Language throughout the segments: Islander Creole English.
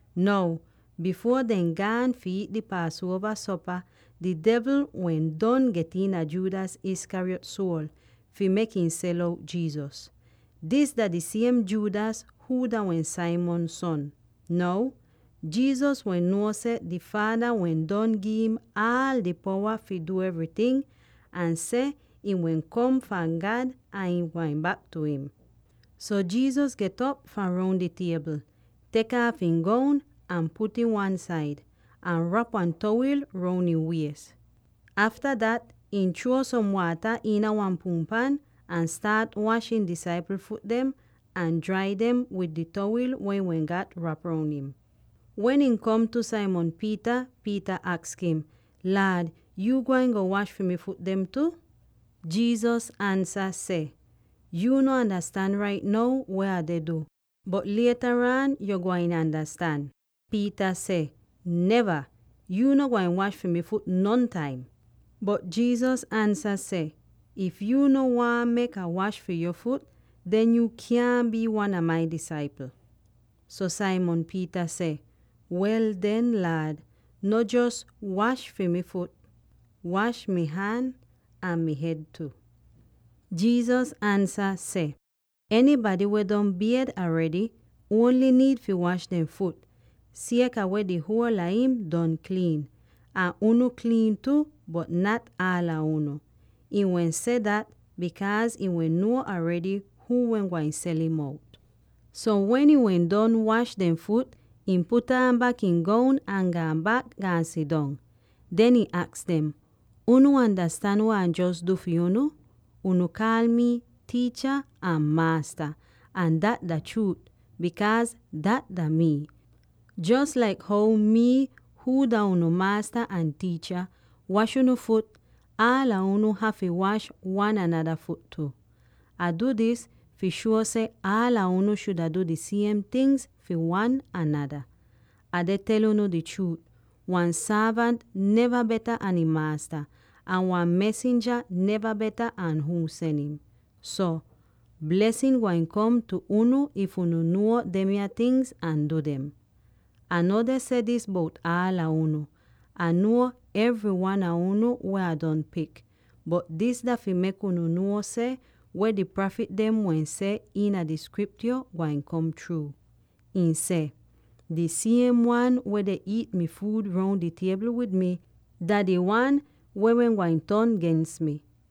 Now, bifuor dehn gaan fi iit di Paasuova sopa, di devl wehn don get iina Judas Iscariot suol fi mek ihn sel out Jesus. Dis dah di siem Judas huu dah wehn Simon son. Now Jesus wehn nuo seh di Faada wehn don gi'im aal di powa fi du evryting, ahn seh ihn wehn kom fahn God ahn ihn gwain bak tu im. So Jesus get'op fahn roun di tiebl, tek aaf ihn goun ahn put'ih wan-said, ahn rap wan towil roun ihn wies. Afta dat, ihn chruo som waata iina wan punpan ahn staat wash ihn disaipl fut dem ahn drai dem wid di towil weh ihn wehn gat rap roun im. Wen ihn kom tu Simon Peter, Peter aks im, “Laad, yu gwain go wash fi mi fut dem tu?” Jesus ansa seh, “Yu no andastan rait now weh Ah deh du, bot lietaraan yu gwain andastan.” Peter seh, “Neva! Yu no gwain wash fi mi fut dem nontaim!” Bot Jesus ansa seh, “If yu no waahn mek Ah wash fi yo fut, den yu kyaahn bii wan a mai disaipl!” So Simon Peter seh, “Wel den, Laad, no jos wash mi fut dem, wash mi han ahn mi hed tu!” Jesus ansa seh, “Enybady weh don bied aredy ongl niid fi wash dehn fut, sieka weh di huol a im don kliin. Ahn unu kliin tu, bot nat aala unu.” Ihn wehn seh dat, bikaaz ihn wehn nuo aredy huu wehn gwain sel'im out. So wen ihn wehn don wash dehn fut, ihn put aan bak ihn goun ahn gaan bak, gaan sidong. Den ihn aks dem, “Unu andastan weh Ah jos du fi unu? Unu kaal mi ‘Tiicha’ ahn ‘Maasta,’ ahn dat dah chruut, bikaaz dat dah mii. Jos laik how mii —huu dah unu Maasta ahn Tiicha— wash unu fut, aala unu hafy wash wan anada fut tu. Ah du dis fi shuo seh aala unu shuda du di siem tingz fi wan anada. Ah deh tel unu di chruut: wan sorvant neva beta an ihn maasta, ahn wan mesinja neva beta an huu sen im. So, blesin gwain kom tu unu if unu nuo demya tingz ahn du dem. Ah no deh seh dis bout aala unu; Ah nuo evry wan a unu weh Ah don pik. Bot dis dah fi mek unu nuo seh weh di prafit dem wehn seh iina di Skriptyo gwain kom chruu. Ih seh: ‘Di siem wan weh deh iit mi fuud roun di tiebl wid mi, dah di wan weh wehn gwain ton gens mi.’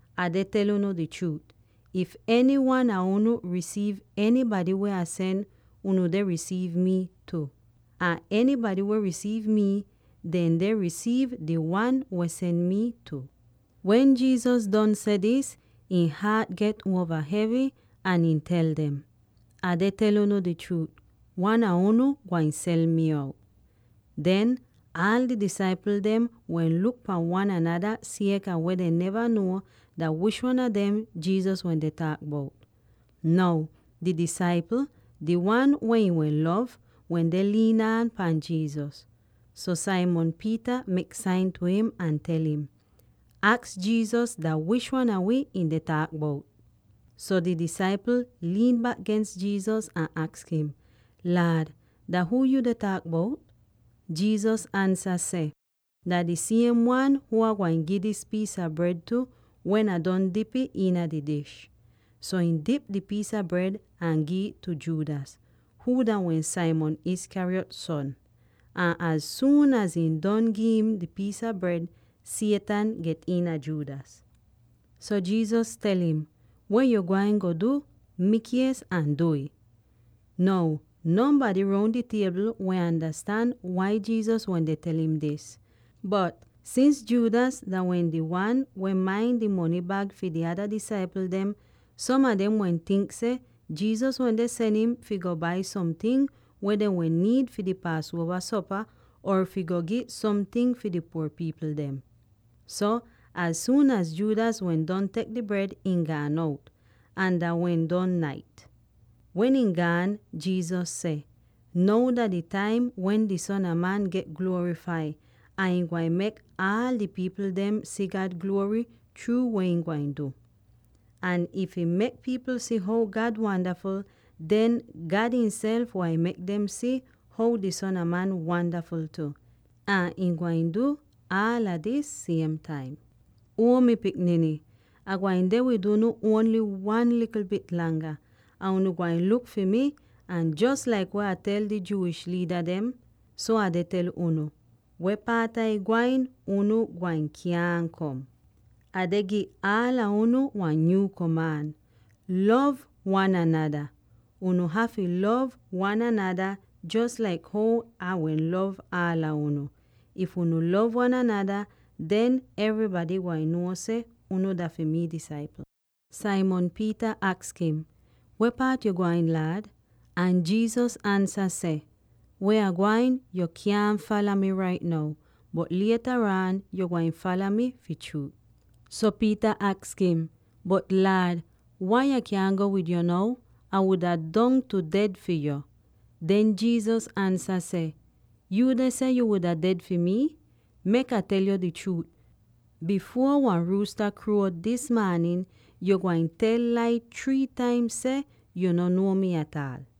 Ah deh tel unu di chruut: if enywan a unu risiiv enybady weh Ah sen, unu deh risiiv mii tu; ahn enybady weh risiiv mi, dehn deh risiiv di Wan weh sen mi tu.” Wen Jesus don seh dis, ihn haat get uova hevy, ahn ihn tel dem, “Ah deh tel unu di chruut: Wan a unu gwain sel mi out.” Den, aala di disaipl dem wehn luk pahn wan anada sieka weh dehn neva nuo dah wish wan a dem Jesus wende taak bout. Now, di disaipl —di wan weh ihn wehn lov— wende liin aan pahn Jesus. So Simon Peter mek sain tu im, ahn tel im, “Aks Jesus dah wish wan a wi ihn deh taak bout.” So di disaipl liin bak gens Jesus ahn aks im, “Laad, dah huu yu deh taak bout?” Jesus ansa seh, “Dah di siem wan huu Ah gwain gi dis piis a bred tu wen Ah don dip'ih iina di dish.” So ihn dip di piis a bred ahn gi'ih tu Judas, huu dah wehn Simon Iscariot son. Ahn az suun az ihn don gi'im di piis a bred, Satan get iina Judas. So Jesus tel im, “Weh yu gwain du, mikies ahn du'ih.” Now nonbady roun di tiebl wehn andastan wai Jesus wende tel im dis. Bot, sins Judas dah wehn di wan weh main di mony bag fi di ada disaipl dem, som a dem wehn tink seh Jesus wende sen im fi go bai somting weh dehn wehn niid fi di Paasuova sopa, or fi go gi somting fi di puor pipl dem. So, az suun az Judas wehn don tek di bred, ihn gaan out; ahn dah wehn don nait. Wen ihn gaan, Jesus seh, “Now dah di taim wen di Son a Man get gluorifai, ahn ihn gwain mek aal di pipl dem si God gluory chruu weh ihn gwain du! Ahn if ihn mek pipl si how God wandaful, den God ihnself gwain mek dem si how di Son a Man wandaful tu, ahn ihn gwain du aala dis siem taim. “Uo mi pikniny, Ah gwain deh wid unu ongl wan likl bit langa. Ahn unu gwain luk fi mi, ahn jos laik Ah wehn tel di Jewish liida dem, so Ah deh tel unu: Weh paat Ah gwain, unu gwain kyaahn kom. “Ah deh gi aala unu wan nyuu komaan: Lov wan anada! Unu hafy lov wan anada jos laik how Ai wehn lov aala unu. If unu lov wan anada, den evrybady gwain nuo seh unu dah fi mi disaipl.” Simon Peter aks im, “Weh paat yu gwain, Laad?” Ahn Jesus ansa seh, “Weh Ah gwain yo kyaahn fala mi rait now, bot lietaraan yo gwain fala mi fi chruut.” So Peter aks im, “Bot Laad, wai Ah kyaahn go wid yo now? Ah wuda dongtu ded fi yo!” Den Jesus ansa seh, “Yu deh seh yuu wuda ded fi mii? Mek Ah tel yo di chruut: bifuor wan ruusta kruo dis maanin, yu gwain tel lai three taim seh yu no nuo mi ataal.”